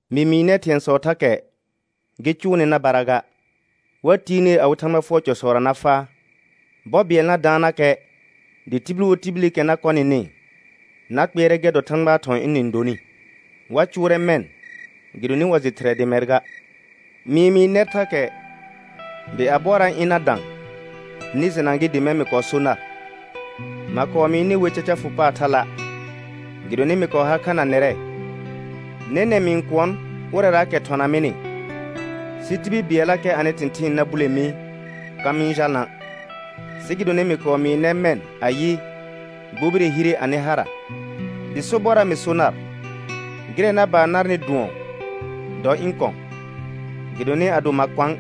Mɩ mɩɩ nɛr thɩ̃ɛsɔɔkɛ thakɛ gɩ cʋʋ nɩ na bara ga. Wa tiir ner awɩ Thãgba fʋɔr cɔsɔra na faa. Bɔ bɩɛl na daannakɛ, dɩ tibil wo tibilikɛ na kɔ nɩnɩ na kpɩɛrɛ gɛr dɔ Thãgbaa thɔ̃ ɩnɩ-n donɩ. Wa cʋʋrɛ mɛ̃ gɩdonɩ wa jɩ Thɩrɛ dɩ mɛr ga. Mɩ-n mɩɩ nɛr thakɛ dɩ a bɔɔra ɩ̃ na dã, nɩ jɩna gɩ dɩ mɛ̃ mɩ kɔɔ so nar. Ma kɔɔ mɩɩ nɩ wer caca fʋ paar thala', gɩdonɩ mɩ kɔɔ har kha na nɛrɛ. Nɛnɛ̃ mɩ-n kʋɔn ʋrɛraakɛ thɔna mɩnɩ, sɩ tibil bɩɛllakɛ anɩ thɩ̃thɩɩn na bule mi ka mɩ-n jalna'. Sɩ gɩdonɩ mɩ kɔɔ mɩɩ nɛr mɛ̃ ayɩ, gbobire hire anɩ hara. Dɩ sobɔrra mɩ so naɩ, gɩrɛ na baan narnɩ dʋɔn, dɔ ɩ̃ kɔ̃ gɩdonɩ ado ma kɔ̃a',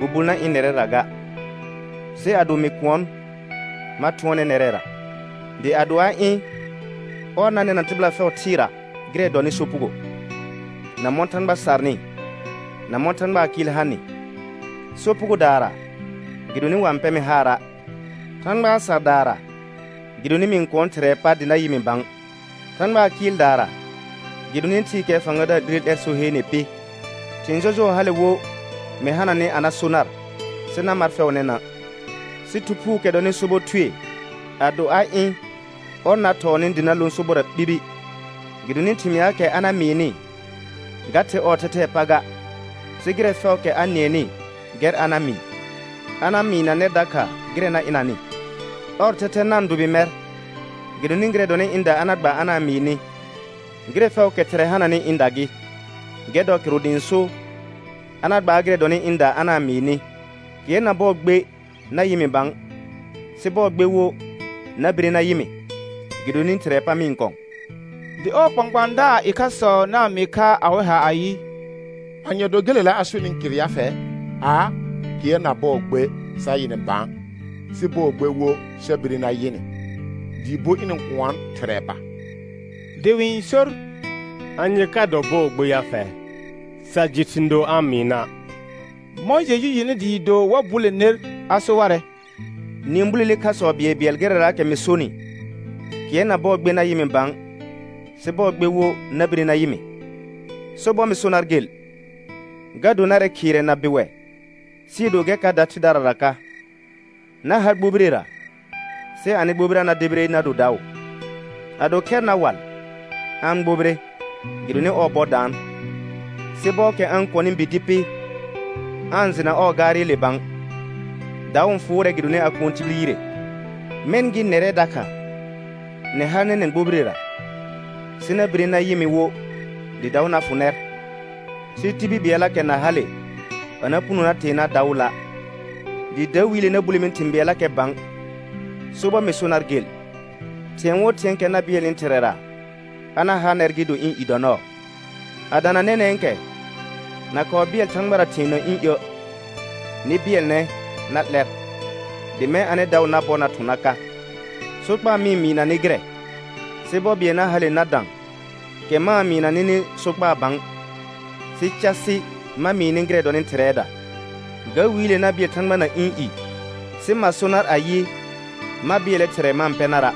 Bubul na ɩ̃ nɛrɛra ga. Sɩ ado mɩ kʋɔn, ma thʋɔnɛ nɛrɛra. Dɩ ado a ɩ̃, ɔr na nɛna tɩbɩla fɛʋ thɩɩra gɩrɛ dɔnɩ sopugo, na mɔ̃ Thãgba sarnɩ, na mɔ̃ Thãgbaa kɩɩl hanɩ: Sopugodaara, gɩdonɩ wa-n pɛ mɩ haara'; Thãgbaa sardaara, gɩdonɩ mɩ-n kʋɔn Thɩrɛɛ pa dɩ na yɩ mɩ bã; Thãgbaa kɩɩldaara, gɩdonɩ thɩɩkɛɛ fãgadaar 'lire 'lɛr so heene pɩ. Thɩ̃ jɔjʋɔ hale wo mɩ hananɩ a na so nar, sɩ na mar fɛʋ nɛnã'. Sɩ Thu Phuukɛ dɔnɩ sobɔ Thue, ado a ɩ̃ ɔr na thɔɔ nɩ dɩ na lõ sobɔrra ɓibi. Gɩdonɩ thɩmɩaakɛ a na mɩɩnɩ, ga the ɔɔ thɛthɛɛ pa ga, sɩ gɩrɛ fɛʋʋkɛ a nɩɛnɩ gɛr a na mɩɩ. A na mɩɩna nɛr dakha gɩrɛ na ɩnanɩ. Ɔr thɛthɛ na-n dʋbɩ mɛr, gɩdonɩ gɩrɛ dɔnɩ ɩ̃da a na gba a na-n mɩɩ nɩ. Gɩrɛ fɛʋʋkɛ Thɩrɛ hananɩ, ɩ̃da gɩ. Gɛr dɔ kɩrʋ dɩ ɩ̃ so: A na gbaar gɩrɛ dɔnɩ ɩ̃da a na-n mɩɩ nɩ. Kɩɛr na bɔɔ gbe na yɩ mɩ bã, sɩ bɔɔ gbe wo na bire na yɩ mɩ, gɩdonɩ Thɩrɛɛ pa mɩ-n kɔ̃. Dɩ ɔɔ kpãkpãadaar ɩkhasɔ na-n mɩɩ kha awɩ ha ayɩ: Anye dɔ gelela a sonɩɩ kɩr ya fɛ? Aa, kɩɛr na bɔɔ gbe sa yɩ nɩ bã, sɩ bɔɔ gbe wo sa bire na yɩ nɩ, dɩɩ bo ɩnɩ-n kʋɔn Thɩrɛɛ pa. Dɩ wɩ-n sor: Anye ka do bɔɔ gbe ya fɛ? Sa jɩ thɩ̃ doo a-n mɩɩna'. Mɔ̃ Jeju jɩnɩ dɩɩ do wa bule ner a so warɛ: Nɩ-n bulele khasɔ bɩɛlbɩɛl gɩrɛraakɛ mɩ sonɩ: Kɩɛr na bɔɔ gbe na yɩ mɩ bã, sɩ bɔɔ gbe wo na bire na yɩ mɩ. Sobɔr mɩ so nar gel, ga do narɛ khɩɩrɛ na bɩwɛ sɩɩ do gɛr ka da thɩdarara ka. Na har gbobirera sɩ anɩ gbobira na debire na do daʋ. Ado khɛr na wal, a-n gbobire gɩdonɩ ɔɔ bɔ daan. Sɩ ɔbɔɔkɛ a-n kɔnɩ bi dɩ pɩ, aa-n jɩna ɔɔ gaarɩle bã. Daʋ n fʋʋrɛ gɩdonɩ a kʋɔn tibil yire. Mɛ̃ gɩ nɛrɛ dakha, nɩ har nɛnɛ̃ gbobirera, sɩ na bire na yɩ mɩ wo dɩ daʋ na fʋ nɛr, sɩ tibil bɩɛllakɛ na hale a na puno na tee nar daʋʋla'. Dɩ dawiile na bule mi thɩ̃ bɩɛllakɛ bã. Sobɔr mɩ so nar gel, thĩɛ wo thɩ̃ɛɛkɛ na bɩɛlnɩ Thɩrɛra, a na ha nɛr gɩ do ɩ̃ i dɔ nɔɔ. A dana nɛnɛ̃kɛ, na kɔɔ bɩɛl Thãgbara thɩ̃ɛ na ɩ̃ iə'. Nɩ bɩɛlnɛ na 'lɛr, dɩ mɛ̃ anɩ daʋ na bɔr na thʋ̃ na ka. Sokpaa mɩ-n mɩɩna nɩ gɩrɛ, sɩ bɔ bɩɛl na hale na da kɛ ma-n mɩɩna nɩnɩ sokpaa bã, sɩ casɩ ma mɩɩ nɩ gɩrɛ dɔnɩ Thɩrɛɛda. Ga wiile na bɩɛl Thãgba na ɩ̃ i sɩ ma so nar ayɩ, ma bɩɛlɛ Thɩrɛ ma-n pɛ nara';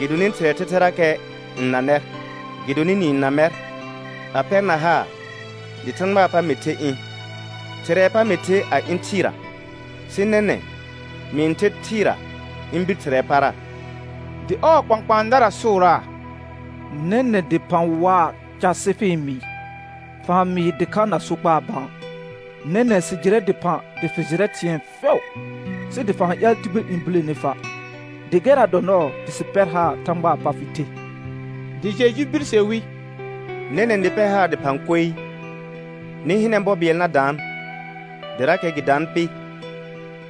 gɩdonɩ Thɩrɛɛ thɛthɛrakɛ n na nɛr, gɩdonɩ nɩ-n na mɛr a pɛrna haar dɩ Thãgbaa pa mɩ the ɩ̃. Thɩrɛɛ pa mɩ the a ɩ̃ thɩɩra. Sɩ nɛnɛ̃ mɩ-n ther thɩɩra ɩ̃ bir Thɩrɛɛ para. Dɩ ɔɔ kpãkpãadara sʋʋraa: Nɛnɛ̃ dɩphã waa casɩ fɩ-n mɩɩ. Fa-n mɩɩ dɩkha na sokpaa bã. Nɛnɛ̃ sɩ jɩrɛ dɩphã dɩ fɩ jɩrɛ thɩ̃ɛ fɛʋ, sɩ dɩ fa-n ƴaal tibil n bulene fa'. Dɩ gɛrra dɔ nɔɔ dɩ sɩ pɛr haar Thãgbaa pa fɩ the. Dɩ Jeju birse wi: Nɛnɛ̃ nɩ pɛr haar dɩphã koee? Nɩ hɩnɛ bɔ bɩɛl na daan, dɩrakɛ gɩ daan pɩ,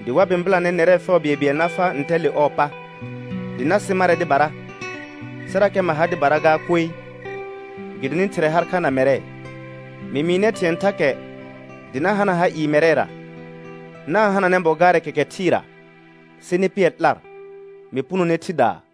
dɩ wa bɩ̃bɩlanɛ nɛrɛ fɛʋ bɩɛlbɩɛl na faa ntɛ le ɔɔ pa, dɩ na sɩ marɛ dɩbara; sɩrakɛ ma ha dɩbara gaa koe, gɩdonɩ Thɩrɛ har kha na mɛrɛ. Mɩ mɩɩ nɛr thɩ̃ɛ thakɛ dɩ na hana ha ɩɩ mɛrɛra. Na-n hananɛ bɔ gaarɛ kɛkɛ thɩɩra, sɩ nɩ pɩɛr 'lar, mɩ punone thɩdaa.